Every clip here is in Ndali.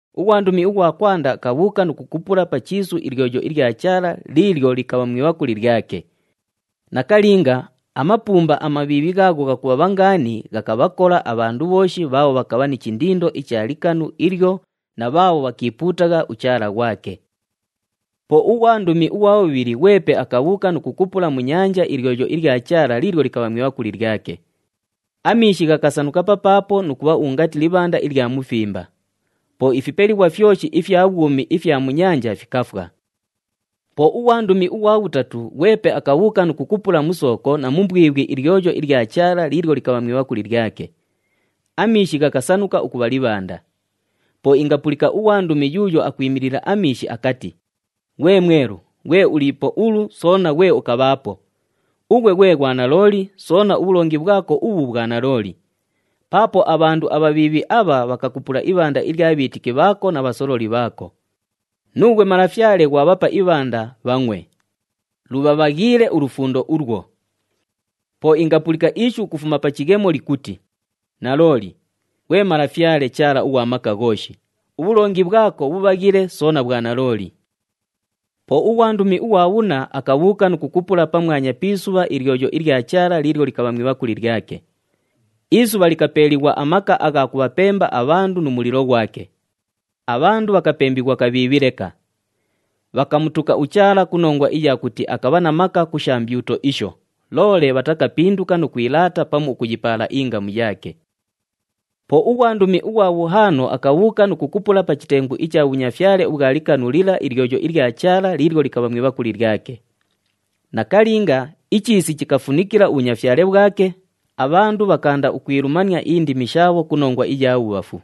Ughwandumi ughwa kwanda akabhuuka nu kukupula pa chiisu ilyoyo ilya Chaala liilyo likabha mu ibhakuli lyake. Nakalinga, amapuumba amabhiibhi ghaagho ghakubhabha ngaani ghakabhakola abhandu bhooshi bhaabho bhakabha ni chindindo icha likanu ilyo na bhaabho bhakiipuutagha uchaala ghwake. Po ughwandumi ughwa bhubhili ghwepe akabhuuka nu kukupula mu nyanja ilyoyo ilya Chaala liilyo likabha mu ibhakuli lyake. Amiishi ghakasanuka papaapo nu kubha ungati libhanda ilya mufimba. Po ifipelighwa fyoshi ifya bhwumi ifya mu nyanja fikafwa. Po ughwandumi ughwa bhutatu ghwepe akabhuuka nu kukupula mu sooko na mu mbwibhwi ilyoyo ilya Chaala liilyo likabha mu ibhakuli lyake. Amiishi ghakasanuka ukubha libhanda. Po ingapulika ughwandumi yuuyo akwimilila amiishi akati, “Ghwe Mwelu, ghwe uliipo ulu, soona ghwe ukabhaapo! Ughwe ghwe ghwanalooli, soona ubhulongi bhwako ubhu bhwa nalooli. Paapo abhandu abhabhiibhi abha bhakakupula ibhanda ilya bhiitiki bhaako na bhasololi bhaako. Nuughwe Malafyale ghwabhapa ibhanda, bhangʼwe. Lubhabhaghiile ulufundo ulwo!” Po ingapulika ishu ukufuma pa chighemo likuti, “Nalooli! Ghwe Malafyale Chaala ughwa Maka Ghooshi, ubhulongi bhwako bhubhaghile soona bhwa nalooli.” Po ughwandumi ughwa bhunna akabhuuka nu kukupula pamwanya pi isubha ilyoyo ilya Chaala liilyo likabha mu ibhakuli lyake. Isubha likapeeliighwa amaka agha kubhapemba abhandu nu mulilo ghwake. Abhandu bhakapembighwa kabhiibhi leka. Bhakamutuka uChaala ku nongwa iya kuti akabha na maka ku sha mbyuto isho, loole bhatakapinduka nu kwilaata pamu ukuyipaala ingamu yaake. Po ughwandumi ughwa bhuhaano akabhuuka nu kukupula pa chitengu icha bhunyafyale ubhwa likanu lila ilyoyo ilya Chaala liilyo likabha mu ibhakuli lyake. Nakalinga, ichiisi chikafunikila ubhunyafyale bhwake, abhandu bhakaanda ukwilumania indimi shaabho ku nongwa iya bhubhafu.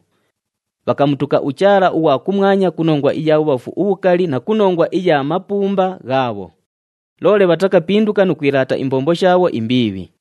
Bhakamutuka uChaala ughwa kumwanya ku nongwa iya bhubhafu ubhukali na ku nongwa iya mapuumba ghaabho. Loole bhatakapinduka nu kwilaata imbombo shaabho imbiibhi.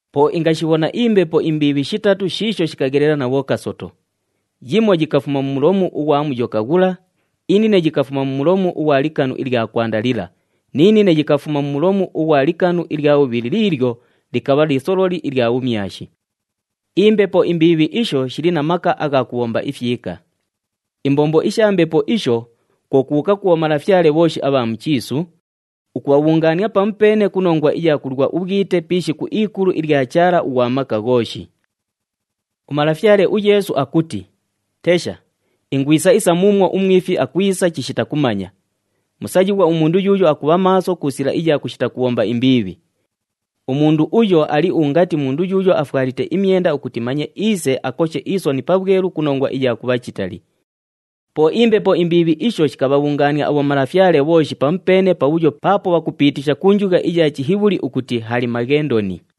Po ingashibhona imbepo imbiibhi shitatu shiisho shikaghelela na bhokasoto. Yimo yikafuma mu mulomu ughwa Muyoka ghula, inine yikafuma mu mulomu ughwa likanu ilya kwanda lila, ni nine yikafuma mu mulomu ughwa likanu ilya bhubhili liilyo likabha lisololi ilya bhumyashi. Imbepo imbiibhi isho shili na maka agha kubhomba ifyika. Imbombo isha mbepo isho, kwo kubhuuka ku bhomalafyale bhooshi abha mu chiisu, ukubhabhungaania pamupeene ku nongwa iya kulwa ubhwite pi ishiku ikulu ilya Chaala ughwa Maka Ghooshi. UMalafyale uYeesu akuti, “Tesha! Ingwisa isa muumwo umwifi akwisa chishita kumanya. Musayighwa umundu yuuyo akubha maaso ku sila iya kushita kubhomba imbiibhi. Umundu uyo ali ungati mundu yuuyo afwalite imyenda ukuti manye iise akoshe isoni pabhwelu ku nongwa iya kubha chitali.” Po imbepo imbiibhi isho shikabhabhungaania abhomalafyale bhooshi pamupeene pabhuyo paapo bhakupiitisha ku njugha iya Chihibhuli ukuti Hali-Maghendoni.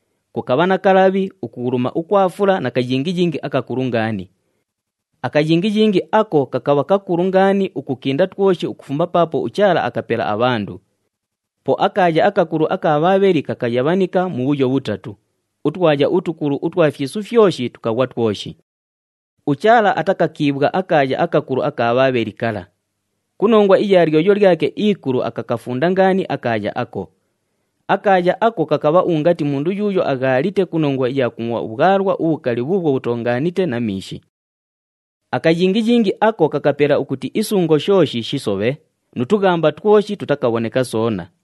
Kukabha na kalabhi, ukughuluma ukwa fula na kayingiyingi akakulu ngaani. Akayingiyingi ako kakabha kakulu ngaani ukukinda twoshi ukufuma paapo uChaala akapela abhandu. Po akaaya akakulu aka Bhaabheli kakayabhanika mubhuyo bhutatu, utwaya utukulu utwa fyisu fyoshi tukaghwa twoshi. UChaala atakakiibhwa akaaya akakulu aka Bhaabheli kala. Ku nongwa iya lyoyo lyake ikulu akakafunda ngaani akaaya ako. Akaaya ako kakabha ungati mundu yuuyo aghaalite ku nongwa iya kungʼwa ubhwalwa ubhukali bhuubhwo bhutoongaanite na miishi. Akayingiyingi ako kakapela ukuti isungo shooshi shisobhe, nu tughamba twoshi tutakabhoneka soona.